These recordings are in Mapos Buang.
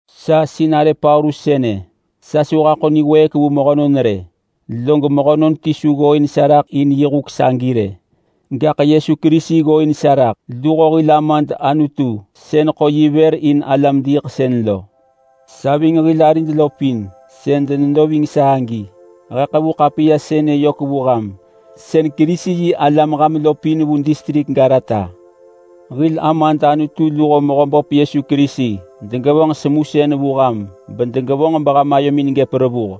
Sa sinarë Paulus sënë, sa su haḳo niwëëk vu mehönon rë, log mehönon ti su ggooin sa raḳ in huk sagi rë. Gaḳ Yesu Kerisi ggooin sa raḳ, luho hil Amad Anutu sën ḳo yi vër in alam-diiḳsën lo. Sa ving hil arid lo pin sën denedo ving sa agi, he ḳevu ḳapiya sënë yök vu ham sën Kerisi-yi-alam ham lo pin vu distrik Galata. Hil Amad Anutu luho Mehöböp Yesu Kerisi degevonġ semusën vu ham bedegevonġ beham ayomin gëp revuh.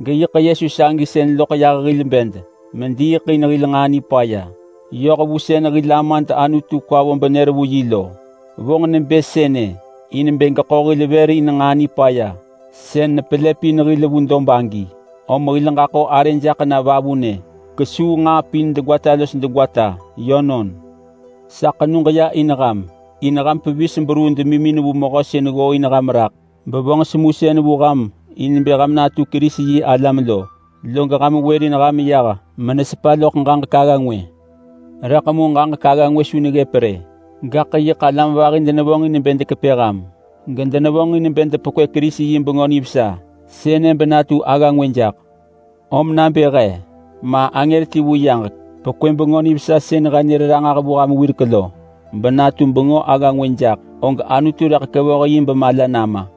Geyiḳ Yesu sagi sën loḳ yah hil bed mediiḳ in hil nġaa nipaya, yoh vu sën hil Amad Anutu kwa vo benër vu yi lo. Vonġ nebë sënë in bë geḳo hil vër in nġaa nipaya sën nepelëpin hil vu dob agi, om hil ġaḳo arë jaḳ na vavunë kesuu nġaa pin degwata los degwata. Yönon. Sa ḳenug ya in ham, in ham pevis beruu demimin vu Mehö sën ggooin ham raḳ bevonġ semusën vu ham in bë ham natu Kerisi-yi-alam lo. Log ham wërin ham yah menesepa loḳ ġaġek agga ngwë. Rëḳ mu ġaġek agga ngwë su neggëp rë, gaḳ yiḳ alam vahi denevonġin bë dekepë ham, gedenevonġin bë depekwë Kerisi yi Bengö Nivesa sënë benatu agga ngwë jaḳ. Om nabë he ma angër ti vu yaġek pekwë Bengö Nivesa sën he nër ranġah vu ham wirek lo benatu bengö agga ngwë jaḳ, og Anutu rëḳ kevoh yi bemala nama.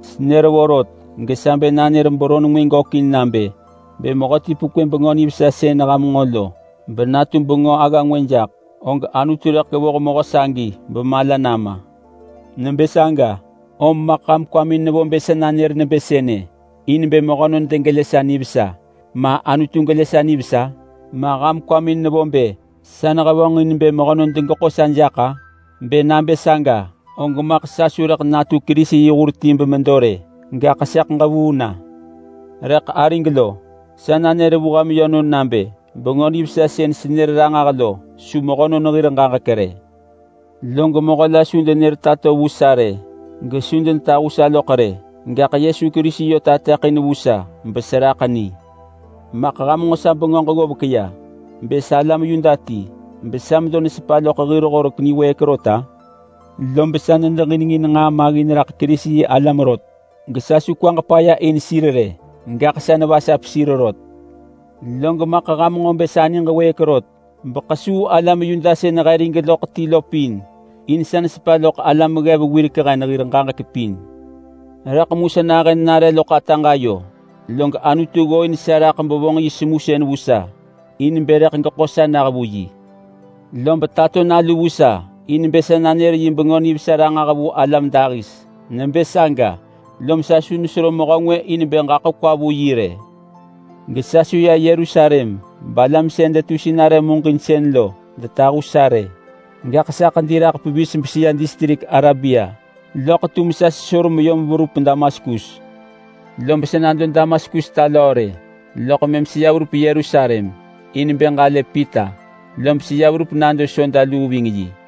Senër vorot gesa bë nanër beron ngwë gökin nabë: Bë mehöti pekwë Bengö Nivesa sën ham nġo lo benatu Bengö agga ngwë jaḳ, og Anutu rëḳ kevoh mehö sagi bemala nama. Nebë saga, om maḳ ham kwamin nevo bë sa nanër nebë sënë in bë mehönon degelë sa nivesa ma, Anutu gelë sa nivesa? Ma ham kwamin nevo bë sa nehevonġin bë mehönon degeḳo sa jaḳ-a? Bë nabë saga og maḳ sa su rëḳ natu Kerisi yi hur ti bemedo rë, gaḳ sëḳ ġevuu na. Rëḳ arig lo, sa nanër vu ham yönon nabë Bengö Nivesa sën senër ranġah lo su mehönon hir ġaġek rë. Log mehö la su denër tato vu sa rë, gesu denetahu sa loḳ rë, gaḳ Yesu Kerisi yö tateḳin vu sa beseraḳ ni. Maḳ ham nġo sa bengöġ ggovek ya bë sa alam Yuda ti besa medo nesepa loḳ hir Horek niwëëk rot-a? Lob sa nedeġinengin nġaa maggin raḳ Kerisi-yi-alam rot gesa su kwaġ paya in sir rë, gaḳ sa nevasap sir rot. Log maḳ ham nġo bë sa niġ wëëk rot beḳesuu alam Yuda sën he rig loḳ ti lo pin, in sa nesepa loḳ alam ggev wirek hen hir ġaġek pin. Rëḳ mu sa nahën nare loḳ ataġ ayo log Anutu ggooin sa raḳ bevonġ yi semusën vu sa in bë rëḳ geḳo sa nah vu yi. Lob tato Nalu vu sa in bë sa nanër yi Bengö Nivesa ranġah vu alam dahis. Nebë saga, lom sa su nesero mehö ngwë in bë ġaḳo kwa vu yi rë. Gesa su ya Yerusalem balam sën detu sinarë muġinsën lo detahu sa rë. Gaḳ sa ḳedi raḳ pevis beseya distrik Arabia loḳ tum sa sesor meyom verup Damaskus. Lob sa nado Damaskus ta löö rë, loḳ mëm seya verup Yerusalem in bë ġalë Pita, lob seya verup nado soda luu ving yi.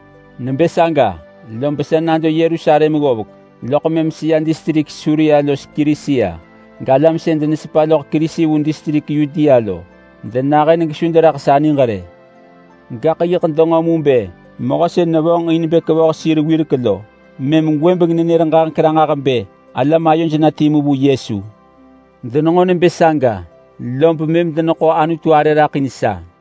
Nebë saga, lob sa nado Yerusalem ggovek, loḳ mëm seya distrik Suria los Kilisia, galam sën denesepa loḳ Kerisi vu distrik Yudea lo denahën gesu deneraḳ sa niġ rë. Gaḳ yiḳ denġo mu bë mehö sën nevonġin bë kevoh sir wirek lo, mëm gwëbeng nenër ranġah bë alam ayoj na timu vu Yesu. Denenġo nebë saga lob mëm deneḳo Anutu arë raḳ in sa.